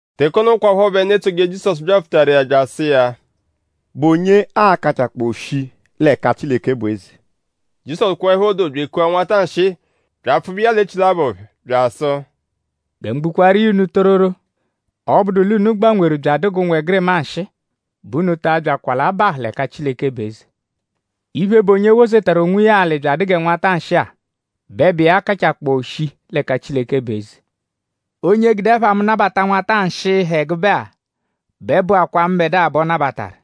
Teke ono kwaphọ bẹ ndu etsoje Jizọsu byapfutaru iya bya asụ iya: “?Bụ onye a-kachakpọo shii l'ẹka Chileke bụ eze?” Jizọsu kweẹpho doo; bya ekua nwata nshịi; bya apfụbe iya l'echilabọ phẹ; bya asụ: “Gẹ mu gbukwaaru iya unu tororo; ọ -bụdu l'unu gbanweru bya adụ g'ụnwegirima nshịi; bẹ unu ta abyakwa l'abahụ l'ẹka Chileke bụ eze. Iphe, bụ onye wozetaru onwiya alị bya adụ gẹ nwata nshịi-a bẹ bụ iya kachakpọo shii l'ẹka Chileke bụ eze. Onye gude ẹpha mu nabata nwata nshịi, ha ẹgube-a; bẹ bụakwaa mbẹdua bẹ ọ nabataru.”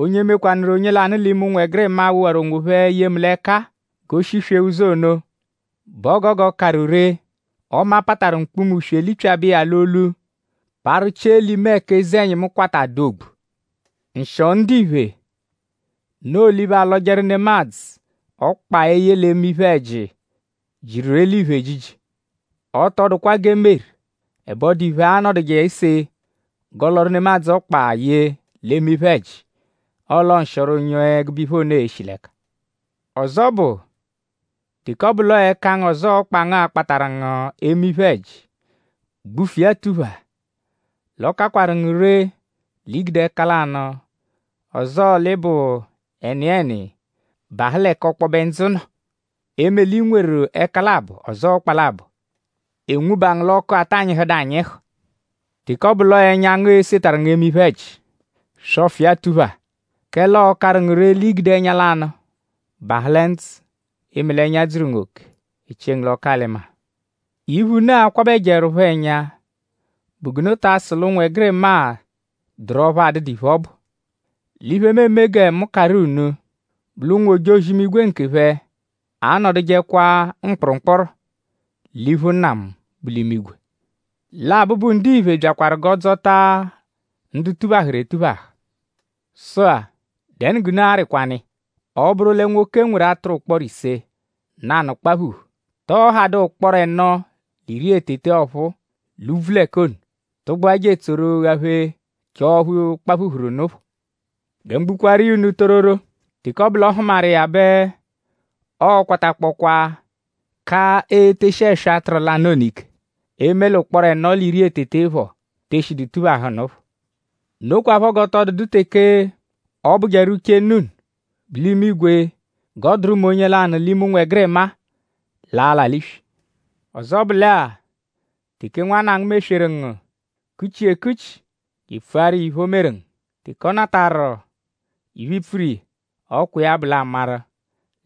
“Onye mekwanụru onye lanụ l'ime ụnwegirima-a, wowaru onwophẹ ye mu l'ẹka-a g'o shiswee ụzo ono bẹ ọ gogo karụ ree; ọme a pataru mkpuma-uswe lipyabẹ iya l'olu; parụ chie l'ime ẹka eze-ẹnyimu kwata dụ ogbu. Nshịo ndiphe; noo l'iphe, alọjeru nemadzụ ọkpa eye l'eme iphe-ẹji jiru eliphe ejiji. Ọ tọ dụkwa g'e meru; ẹbe ọ dụ iphe, a-nọduje ese g'ọ lọru nemadzụ ọkpa ye l'eme iphe-ẹji. Ọle; nshịoro onye ẹgube iphe ono e-shi l'ẹka. “Ọzo bụ; teke ọ bụ l'ọo ẹka ngu; ọzoo ọkpa ngu a-kpatarụ ngu eme iphe-ẹji; gbufu iya tuphaa. L'ọ kakwaru ngu ree l'i gude ẹka lanụ; ọzoo l'ị bụ ẹniyeni; bahụ l'ẹka ọkpobe ndzụ nọ; eme l'i nweru ẹka labọ; ọzoo ọkpa labọ; e nwuba ngu l'ọku, ata nyịhudu anyịhu. Teke ọ bụ l'ọo ẹnya ngu e-setarụ ngu eme iphe-ẹji; swọfu iya tuphaa; kẹle ọ karụ ngu ree l'i gude ẹnya lanụ bahụ lẹ ndzụ; eme l'ẹnya dzuru ngu oke; e chie ngu l'ọku-alị-maa.” “Iphe, unu a-kwabẹjeerupho ẹnya bụ g'unu ta asụ l'ụnwegirima-a dụru ọphu adụdu iphe, ọ bụ. L'iphe, mu eme gẹ mu karụ unu bụ l'ụnwu-ojozi-imigwe nkephẹ anọdujekwa mkpụrumkpuru l'iphu Nna mu, bu l'imigwe. Lẹ Abụbu-Ndiphe byakwaru g'ọ dzọta ndu tuphahụru etuphahụ. “Sụ-a;?dẹnu g'unu arịkwanu iya? Ọ -bụru lẹ nwoke nweru atụru ụkporo ise; nanụ kpaphuhu;?tọo hadụ ụkporo ẹno l'iri lẹ tete ọphuu l'úbvú l'ẹka ono; tụgbua je etsoru ghaphee chọo ọphu kpaphuhuru nụ phọ? Gẹ mu gbukwaaru iya unu tororo; teke ọ bụ l'ọ hụmaru iya bẹ ọo-kwatakpọkwaa ka eteshi ẹswa atụru lanụ ono ike; e -me l'ụkporo ẹno l'iri lẹ tete phọ, te eshidu tuphahụ nụ phọ. Nokwaphọ g'ọ tọ dụdu teke ọ bụjeru uche Nna unu, bu l'imigwe g'ọ dụru mẹ onye lanụ l'ime ụnwegirima-a, l'a-la l'iswi.” “Ọzo bụ lẹ-a; teke nwanna ngu mesweru ngu; kuchi iya ekuchi; je epfuaru iya iphe, o meru ngu. Teke ọ natarụ iphe, i pfuru iya; ọ kwa iya bụ l'a maru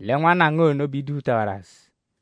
lẹ nwanna ngu ono bẹ i duphutawaru azụ.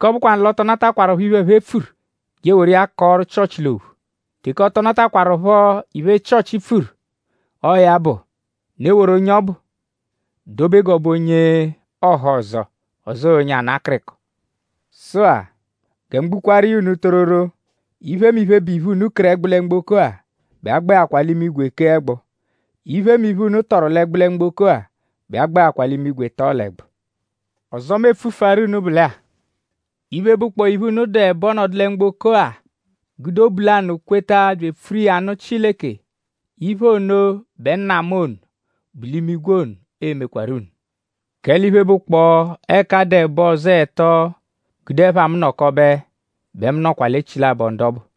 Teke ọ bụkwanu l'ọ tọ natakwarụpho iphe, ẹphe pfuru; je eworu iya kọoru Chịochi l'ophu. Teke ọ tọ natakwarụpho iphe, Chịochi pfuru; ọo ya bụ; unu eworu onye ọbu dobe g'ọ bụ onye ọhozo; ọzoo onye ana akịriko. “Sụ-a; gẹ mu gbukwaaru iya unu tororo; iphemiphe, bụ iphe, unu keru ẹgbu lẹ mgboko-a bẹ a gbẹakwaa l'imigwe kee ẹgbu. Iphemiphe, unu tọru l'ẹgbu lẹ mgboko-a bẹ a gbẹakwaa l'imigwe tọo l'ẹgbu. “Ọzo, mu e-pfufuaru unu bụ lẹ-a; iphe, bụkpoo iphe, unu dụ ẹbo nọdu lẹ mgboko-a; gude obu lanụ kweta bya epfuru iya nụ Chileke; iphe ono bẹ Nna mu ono, bu l'imigwe ono e-mekwarụ unu. Kẹle iphe, bụkpoo ẹka a dụ ẹbo; ọzoo ẹto gude ẹpha mu nọkobe; bẹ mu nọkwa l'echilabọ ndu ọbu.”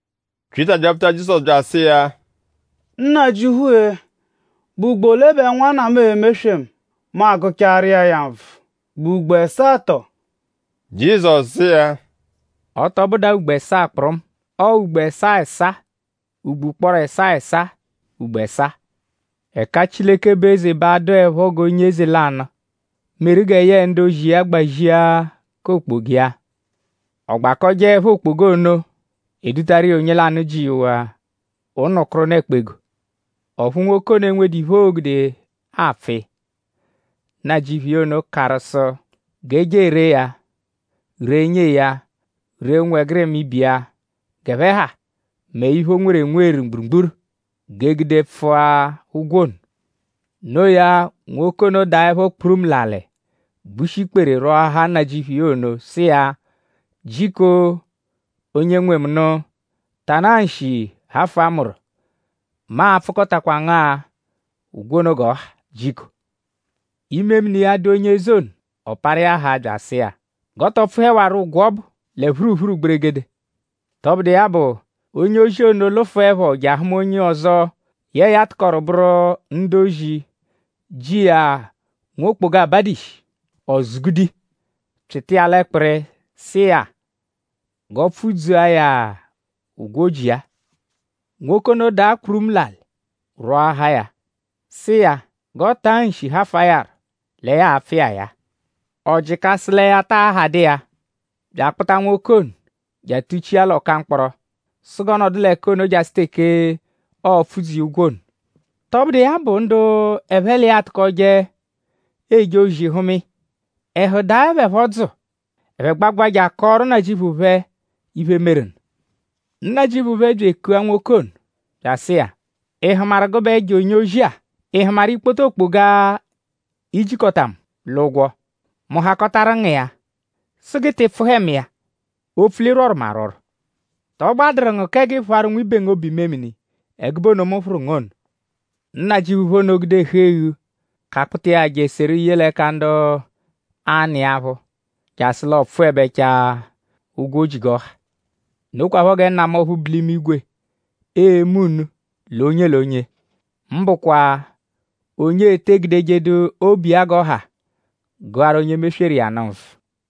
Pyịta byapfuta Jizọsu bya asụ iya: “Nnajịuphu-e;?bụ ugbo ole bẹ nwanna mu e-meswe mu; mu agụchaaru iya ya nvụ??Bụ ugbo ẹsaa tọo?” Jizọsu sụ iya: “Ọ tọ bụdu-a ugbo ẹsaa kpụrumu. Ọo ugbo ẹsaa ẹsaa ugbo ụkporo ẹsaa ẹsaa ugbo ẹsaa. Ẹka Chileke bụ eze bẹ a-dụepho g'onye eze lanụ, meru gẹ yẹe ndu-ozi iya gbazia k'okpoga iya. Ọ gbakọjeepho okpoga ono; e dutaru iya onye lanụ, ji iya ụnu-kụru-ụnu ẹkpa-ego. Ọphu nwoke ono enwedu iphe, o gude apfụ iya. Nnajịuphu iya ono karụ sụ g'e ree ya; ree nyee ya; ree ụnwegirima ibe iya g'ẹphe ha; mẹ iphe, o nweru enweru mgburugburu; g'e gude pfụa ụgwo ono. No iya; nwoke ono daẹpho kpurumu l'alị gbushi ikpere rwọahaa nnajịuphu iya ono sụ iya: ‘Jiko onye nwe mu nụ; tanaa nshi hafụa mu rọ. Mu a-pfụkotakwa ngu-a ụgwo ono g'ọ ha jiko.’ Imemini iya dụ onye eze ono. Ọ parụ iya haa bya asụ iya g'ọ tọ pfụhewaro ụgwo ọbu lẹ phuruphuru gberegedege. “Tọbudu iya bụ; onye-ozi ono lụfuepho je ahụma onye ọzo, yẹe ya tụkoru bụru ndu-ozi, ji iya nwokpoga, abadu ishi. Ọ zụ-gude iya; pyịta iya l'ẹkpiri; sụ iya g'ọ pfụ-dzua ya ụgwo, o ji iya. Nwoke ono daa kpurumu l'alị rwọahaa ya; sụ iya g'ọ taa nshi hafụa ya rọ lẹ ya a-pfụ iya ya-a. Ọ jịka sụ lẹ ya taa hadụ iya; bya akpụta nwoke ono je atụ-chia l'ọka mkpọro sụ g'ọ nọdu l'ẹka ono jasụ teke ọo-pfụ iya ụgwo ono. Tọbudu iya bụ; ndu ẹphe l'iya atụkoje eje ozi hụma iya; ẹhu daẹ phẹ phọ dzụ. Ẹphe gbagbụa je akọoru nnajịuphu phẹ iphe, meru nụ. Nnajịuphu phẹ bya ekua nwoke ono; bya asụ iya: ‘?Ị hụmaru gụbe ẹjo onye-ozi-a??Ị hụmaru ikpoto okpoga, i jikọta mu l'ụgwo; mu hakọtaru ngu iya sụ g'ị tị pfụhe mu iya; opfu l'ị rwọru mu arwọrwo? ?Tọ gbadụru ngu kẹ g'ị phụaru nwibe ngu obu-imemini ẹgube ono, mu phụru ngu ono?’ Nnajịuphu phẹ ono gude ẹhu-eghu kakpụta iya je seru ye l'ẹka ndu a-nụ iya aphụ jasụ l'ọ pfụebechaa ụgwo, o ji g'ọ ha. “Nokwaphọ gẹ Nna mu ọphu bu l'imigwe e-me unu l'onye l'onye; mbụkwa onye te egudejedu obu iya g'ọ ha gụaru onye mesweru iya nụ nvụ.”